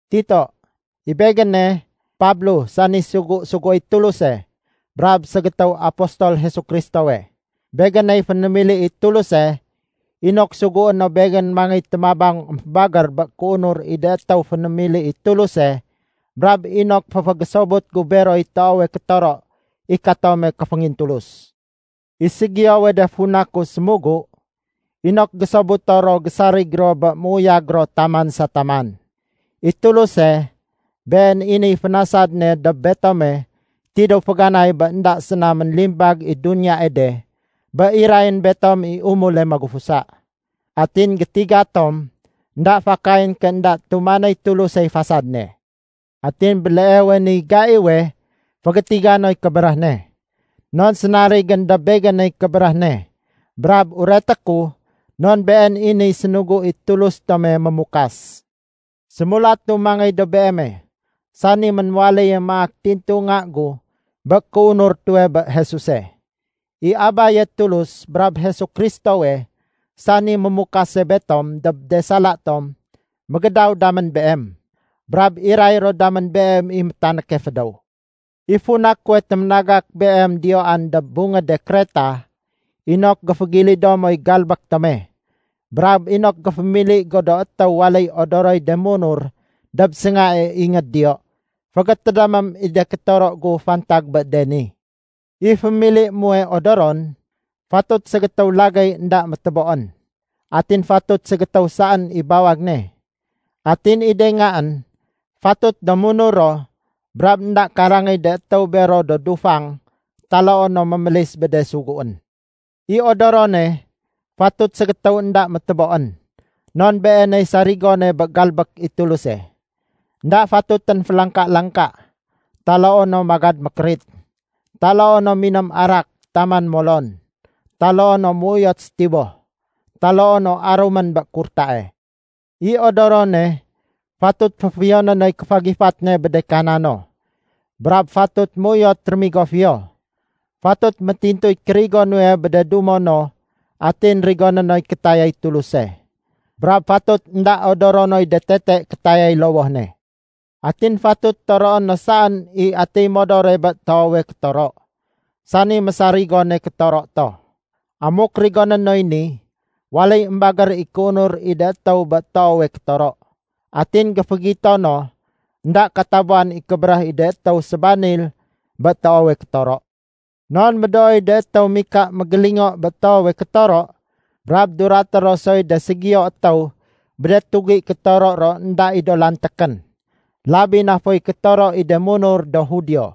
Tito, I begéne, Pablo sani sugu-suguéy Tuluse brab ségétéw apostol Jesu Kristowe. Begéney fénémili i Tuluse inok sugué no begén mangéy témabang émfébagér bé kéunur i de étéw fénémili i Tuluse brab inok féfégésobut gu beroy toowe kétoro i katome kéféngintulus. I ségiyowe de funa ku sémugu, inok gésobuto ro gésarig ro bé méuyag ro taman sa taman. I Tuluse, been i niy fénasad ne dob betome tidéw féganay bé énda séna ménlimbag i duniyae de, bé irayén betom i umule magufusa. Atin gétiga tom énda fakayén ké énda tumanéy Tulusey fasad ne. Atin béleewe niy gaiwe fégétiga noy kébéréh ne. Non sénarigén dob begéney kébéréh ne brab ureté ku non been i niy sénugu i Tulus tome mémukas. Sémulatu mangéy dob beeme, sani ménwaléye maak tintu nga gu bé kéunur tuwe bé Jesuse. I Abaye Tulus brab Jesu Kristowe, sani mémukase betom dob de sala tom, mégédaw damén beem, brab iray ro damén beem i métanéke fédéw. I funa kuwe téménagak beem diyoan dob bungéde Kreta, inok géfégilido moy galbék tome, brab inok géfémili go do étéw waléy odoroy de munur dob séngae ingéd diyo. Fégétédémém i de kétoro gu fantag bé de ni. I fémilié muwe odoron, fatut ségétéw lagéy énda météboén. Atin fatut ségétéw saén i bawag ne. Atin i de ngaén, fatut do munur ro brab énda karangéy de étéw bero do dufang taloo no mémélis bé de suguén. I odorone, fatut ségétéw énda météboén, non beeney sarigone bé galbék i Tuluse. Enda fatutén félangka-langka, taloo no magad mékérit, taloo no miném arak taman molon, taloo no méuyot sétiboh, taloo no arumén bé kurtae. I odorone, fatut féfiyoné noy kéfagifat ne bé de kana no. Brab fatut méuyot rémigo fiyo. Fatut métintuy kérigo nuwe bé de dumo no atin rigoné noy kétayay Tuluse. Brab fatut énda odoro noy de tete kétayay lowoh ne. Atin fatut toroé no saén i atiy modore bé toowe kétoro, sani mésarigone kétoro to. Amuk rigoné noy ni, waléy émbagér i kéunur i de étéw bé toowe kétoro. Atin géfégito no énda katabuwan i kébéréh i de étéw sébanil bé toowe kétoro. Non médooy de étéw mika mégélingo bé toowe kétoro brab duraté ro soy de ségiyo étéw bé de tugi kétoro ro énda i do lantékén, labi na foy kétoro i de munur do Judio.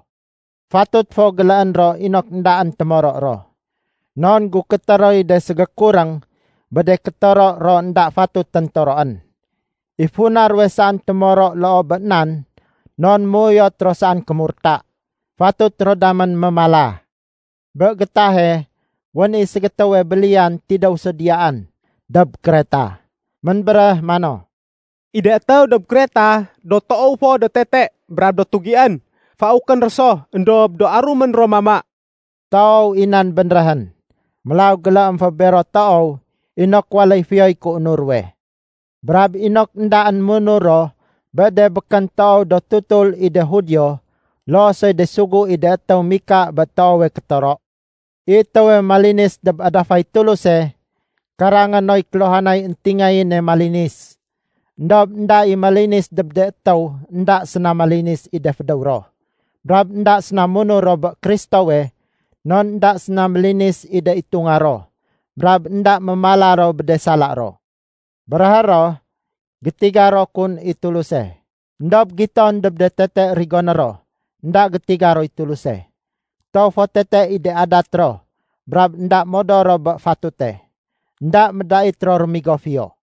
Fatut fo géléén ro inok éndaén témoro ro. Non gukété roy de ségékuréng bé de kétoro ro énda fatutén toroén. I funa ruwe saén témoro loo bé nan non méuyot ro saén kémurta. Fatut ro damén mémala. Bé gétahe wén i ségétéwe béliyan tidéw so diyaan dob Kreta, ménbéréh mano, “I de étéw dob Kreta do toow fo tete brab do tugién. Faukén ro so, éndob do arumén ro mama.” Toow i nan bénréhén. Mélaw géléém fo bero toow inok waléy fiyoy kéunur ruwe. Brab inok éndaén munur ro bé de békén toow do tutul i de Judio loo soy de sugu i de étéw mika bé toowe kétoro. I étéwe malinis dob adafay Tuluse, karangé noy kéluhanay éntingayéne malinis. Endob énda i malinis dob de étéw énda séna malinis i de fédéw ro brab énda séna munur ro bé Kristowe non énda séna mélinis i de itunga ro brab énda mémala ro bé de sala ro. Béréhé ro gétiga ro kun i Tuluse, éndob giton dob de tete rigoné ro énda gétiga roy Tuluse. Toow fo tete i de adat ro brab énda modor ro bé fatute. Enda médait ro rémigo fiyo.